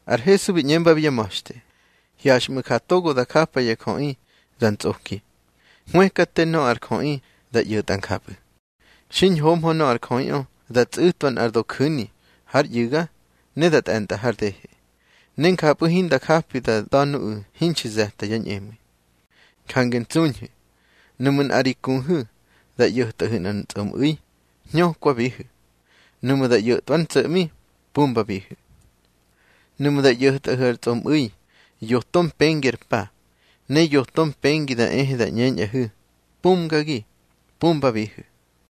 Ar Hesu bi ꞌñembabi yá ma̱xte: —Hyaxmꞌu̱ ja togo da japa ya jöꞌi da ntsꞌoki. Hwëkate nöꞌö ar jöꞌi da ꞌyo̱tꞌa njapꞌu̱. Xiñhohmö nöꞌö ar jöꞌiꞌö da tsꞌu̱twa nꞌar doju̱ni hár ꞌyu̱ga, ne da tꞌe̱ntꞌa har dehe, ne njapꞌu̱ hinda japi da da̱ nuꞌu̱ hinxi ze̱ta yá ñꞌemu̱i. Jange ntsuñhu̱. Nuꞌmu̱ nꞌa ri kuhu̱ da ꞌyo̱tꞌahu̱ nꞌar tsꞌomꞌu̱i, hñökwabihu̱. Nuꞌmu̱ da ꞌyo̱tꞌwa ár ntso̱ꞌmi, pumbabihu̱. Nuꞌmu̱ da ꞌyo̱tꞌahu̱ ar tsꞌomꞌu̱i yoto mpengi ar pa, ne yoto mpengi da ehe da ꞌñeñꞌahu̱: Pumgagi, pumbabihu̱.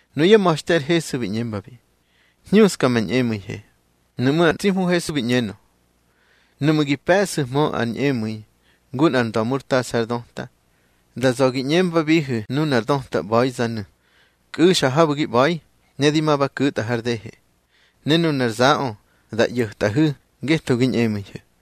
Nuyá ma̱xte ar Hesu bi ꞌñembabi: —Hñuska ma ñꞌemu̱ihe. Nuꞌmú̱ ar tsi Hmu Hesu bi ꞌñenö: —Nuꞌmu̱ gi pe̱ꞌsu̱hmö ar ñꞌemu̱i ngu nꞌar nda̱murtasa ár döta, da za̱ gi ꞌñembabihu̱ nunar döta ꞌba̱izanu̱: Kꞌu̱xa habu̱ gi ꞌba̱i, ne di ma ba ku̱tꞌa har dehe. Ne nunar zaꞌö da ꞌyo̱tꞌahu̱ ngetho gi ñꞌemu̱ihu̱.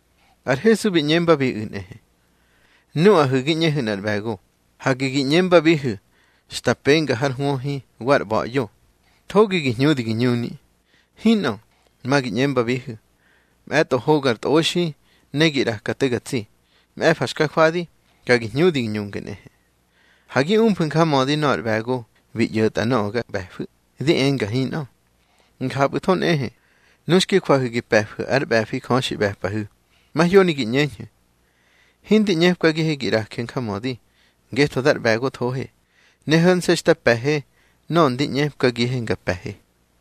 Ar Hesu bi ꞌñembabiꞌu̱ nꞌehe: —Nuꞌahu̱ gi ꞌñehu̱ nꞌar ꞌbe̱go, hage gi ꞌñembabihu̱ xta penga har hwöhi wa ar ꞌba̱ꞌyo: Thogi gi hñudi gi ñuni. Hinꞌö. Ma gi ꞌñembabihu̱: Mꞌe̱tꞌo hogar tꞌoxi, ne gi ꞌraka te ga tsi. Mꞌe̱fa xka jwadi, ka gi hñudi gi ñunge nꞌehe. Ha gi umfu̱ njamödi nöꞌö ar ꞌbe̱go bi ꞌyo̱tꞌa nöꞌö ga ꞌbe̱fu̱. Di enga hinꞌö. Njapꞌu̱tho nꞌehe, nu xki jwahu̱ gi pe̱fu̱ ár ꞌbe̱fi Jö xi ꞌbe̱pꞌahu̱, mahyoni gi ꞌñeñhu̱: Hindi ꞌñepkagihe gi ꞌraje njamödi, ngetho dar ꞌbe̱gothohe, ne ho̱nse̱ xta pe̱he nöꞌö ndi ꞌñepkagihe nga pe̱he.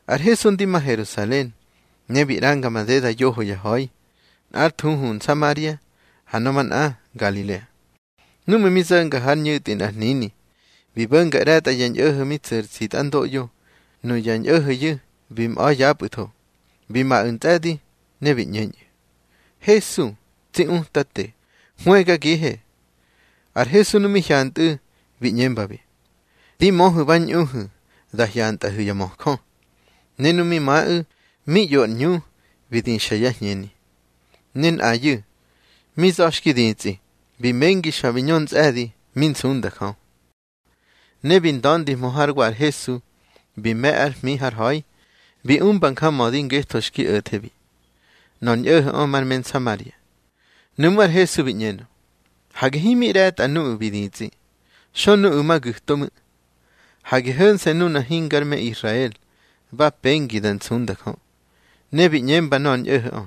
Ar Hesu ndi ma Herusalen, ne bi ꞌranga madeda yoho ya ha̱i, nꞌár thuhu Nsamaria, ha nöꞌö manꞌa Ngalilea. Núꞌmu̱ mi zo̱nga hár ñu̱tꞌi nꞌar hnini, bi bo̱nga ꞌre̱tꞌa ya ñꞌo̱ho̱ mi tsu̱ ar tsitꞌandoꞌyo. Nuya ñꞌo̱ho̱yu̱ bi mꞌa̱ yapꞌu̱tho. Bi maꞌu̱ ntsꞌe̱di, ne bi ꞌñeñꞌu̱: —Hesu, tsi Utate, hwëgagihe. Ar Hesu nu mi hyantꞌu̱, bi ꞌñembabi: —Di möhu̱ ba ñꞌuhu̱ da hyantꞌahu̱ ya möjö. Ne nu mi maꞌu̱, mi ꞌyo ar ꞌñu bi dixa yá hñeni. Ne nꞌayu̱, mi za̱ xki ditsꞌi, bi mengi xa bi ñö ntsꞌe̱di, mi nsunda Jö. Ne bi nda̱ndihmö hár wa ar Hesu, bi me̱ ár hmi har ha̱i, bi umba njamödi ngetho xki o̱thebi. Nöꞌö ar ñꞌo̱ho̱ꞌö mar me Nsamaria. Nuꞌmú̱ ar Hesu bi ꞌñenö: —Hage himi ꞌre̱tꞌa nuꞌu̱ bi ditsꞌi. Xö nuꞌu̱ ma gu̱to ꞌmu̱. Hage ho̱nse̱ nuna hingár me Israel ba pengi da nsunda Jö. Ne bi ꞌñemba nöꞌö ar ñꞌo̱ho̱ꞌö: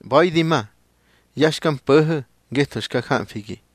—ꞌBa̱i di ma. Ya xka mpo̱ho̱ ngetho xka jamfigi.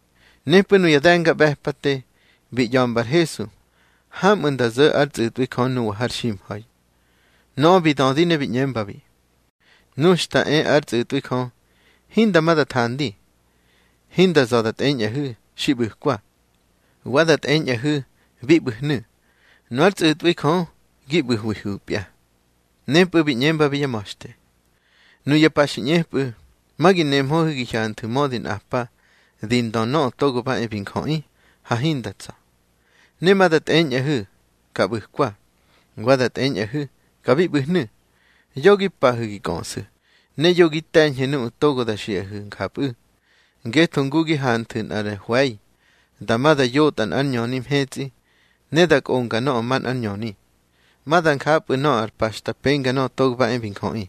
Nepꞌu̱ nuya de̱ngaꞌbe̱pate bi ꞌya̱mba ar Hesu hamꞌu̱ nda zo̱ ár tsꞌu̱tꞌwi Jö nuwa har ximha̱i. Nöꞌö bi dödi ne bi ꞌñembabi: —Nu xta e ár tsꞌu̱tꞌwi Jö, hinda ma da thandi. Hinda za̱ da tꞌeñꞌahu̱: Xi ꞌbu̱kwa. Wa da tꞌeñꞌahu̱: Bi ꞌbu̱hnu̱. Nu ár tsꞌu̱tꞌwi Jö gi ꞌbu̱hwihu̱pya. Nepꞌu̱ bi ꞌñembabi yá ma̱xte: —Nuya pa xi ꞌñepꞌu̱, ma gi nehmöhu̱ gi hyanthu̱ mödi nꞌa pa di ndö Nöꞌö Togo ba e bi Njöꞌi, ha hinda tsa̱. Ne ma da tꞌeñꞌahu̱: Ka ꞌbu̱kwa. Wa da tꞌeñꞌahu̱: Ka bi ꞌbu̱hnu̱. Yo gi pa̱hu̱ gi kꞌöꞌsu̱, ne yo gi te̱ñhu̱ nuꞌu̱ togo da xiꞌahu̱ njapꞌu̱. Ngetho ngu gi hanthu̱ nꞌar hwe̱i dama da yotꞌa nꞌár ñöni mhetsꞌi, ne da kꞌonga nöꞌö manꞌár ñöni, ma da njapꞌu̱ nöꞌö ar pa xta penga Nöꞌö Togo ba e bi Njöꞌi.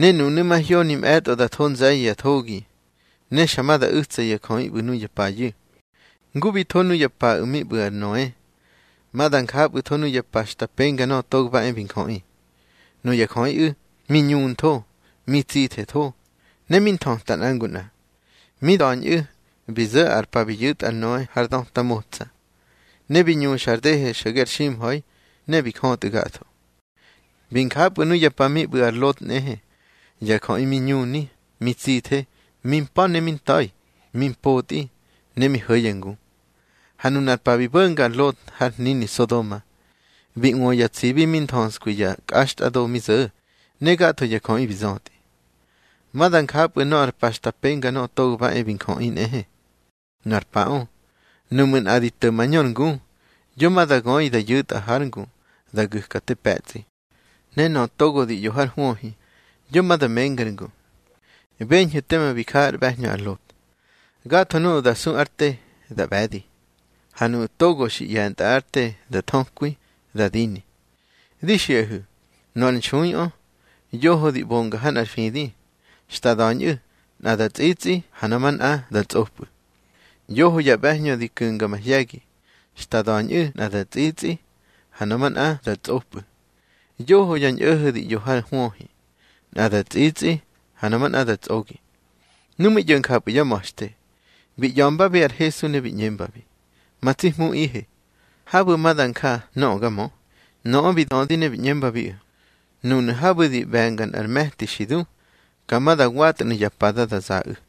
Ne nunu̱ mahyoni mꞌe̱tꞌo da tho nze̱ye̱ ya thogi, ne xa ma da u̱tsa ya jöꞌi ꞌbu̱ nuya payu̱. Ngu bi tho nuya paꞌu̱ mi ꞌbu̱ ar Noe, ma da njapꞌu̱tho nuya pa xta penga Nöꞌö Togo ba e bi Njöꞌi. Nuya jöꞌiꞌu̱ mi ñuntho, mi tsithetho, ne mi nthöta nꞌa ngu nꞌa. Mi da̱ñꞌu̱ bi zo̱ ar pa bi yu̱tꞌa ar Noe har döta motsa, ne bi ñuxa ar dehe xo̱ge ar ximha̱i, ne bi jötꞌu̱ gatho. Bi njapꞌu̱ nuya pa mi ꞌbu̱ ar Lot nꞌehe. Ya jöꞌi mi ñuni, mi tsithe, mi mpa̱ ne mi nta̱i, mi mpotꞌi ne mi ho̱ ya ngu. Ha nunar pa bi bo̱nga ar Lot har hnini Sodoma, bi ꞌwö ya tsibi mi nthöskwi ya kꞌaxtꞌado mi zo̱, ne gatho ya jöꞌi bi zötꞌi. Ma da njapꞌu̱ nöꞌö ar pa xta penga Nöꞌö Togo ba e bi Njöꞌi nꞌehe. Nu ar paꞌö, nuꞌmu̱ nꞌa di to̱ mañör ngu, yo ma da göi da yu̱tꞌa hár ngu da gu̱ka te pe̱tsꞌi. Ne nöꞌö togo di ꞌyo hár hwöhi, yo ma da mengár ngu. Beñhu̱ teme bi ja ár ꞌbe̱hñö ar Lot. Gatho nuꞌu̱ da su ár te, da ꞌbe̱di. Ha nuꞌu̱ togo xi ꞌye̱ntꞌa ár te da thökwi, da dini. Di xiꞌahu̱, nöꞌö ar nxuiꞌö, yoho di ꞌbonga ha nꞌar fidi, xta da̱ñꞌu̱ nꞌa da tsꞌitsꞌi, ha nöꞌö manꞌa da tsꞌopꞌu̱. Yoho ya ꞌbe̱hñö di ku̱nga mahye̱gi, xta da̱ñꞌu̱ nꞌa da tsꞌitsꞌi, ha nöꞌö manꞌa da tsꞌopꞌu̱. Yoho ya ñꞌo̱ho̱ di ꞌyo ha nꞌar hwöhi, nꞌa da tsꞌitsꞌi, ha nöꞌö manꞌa da tsꞌogi. Nu mi ꞌyo̱ njapꞌu̱ yá ma̱xte, bi ꞌya̱mbabi ar Hesu ne bi ꞌñembabi: —Ma tsi Hmuꞌihe, habu̱ ma da nja nöꞌö ga mö. Nöꞌö bi dödi ne bi ꞌñembabiꞌu̱: —Núnu̱ habu̱ di ꞌbe̱nga nꞌar me̱ti xi du, ka ma da watnu̱ ya pada da zaꞌu̱.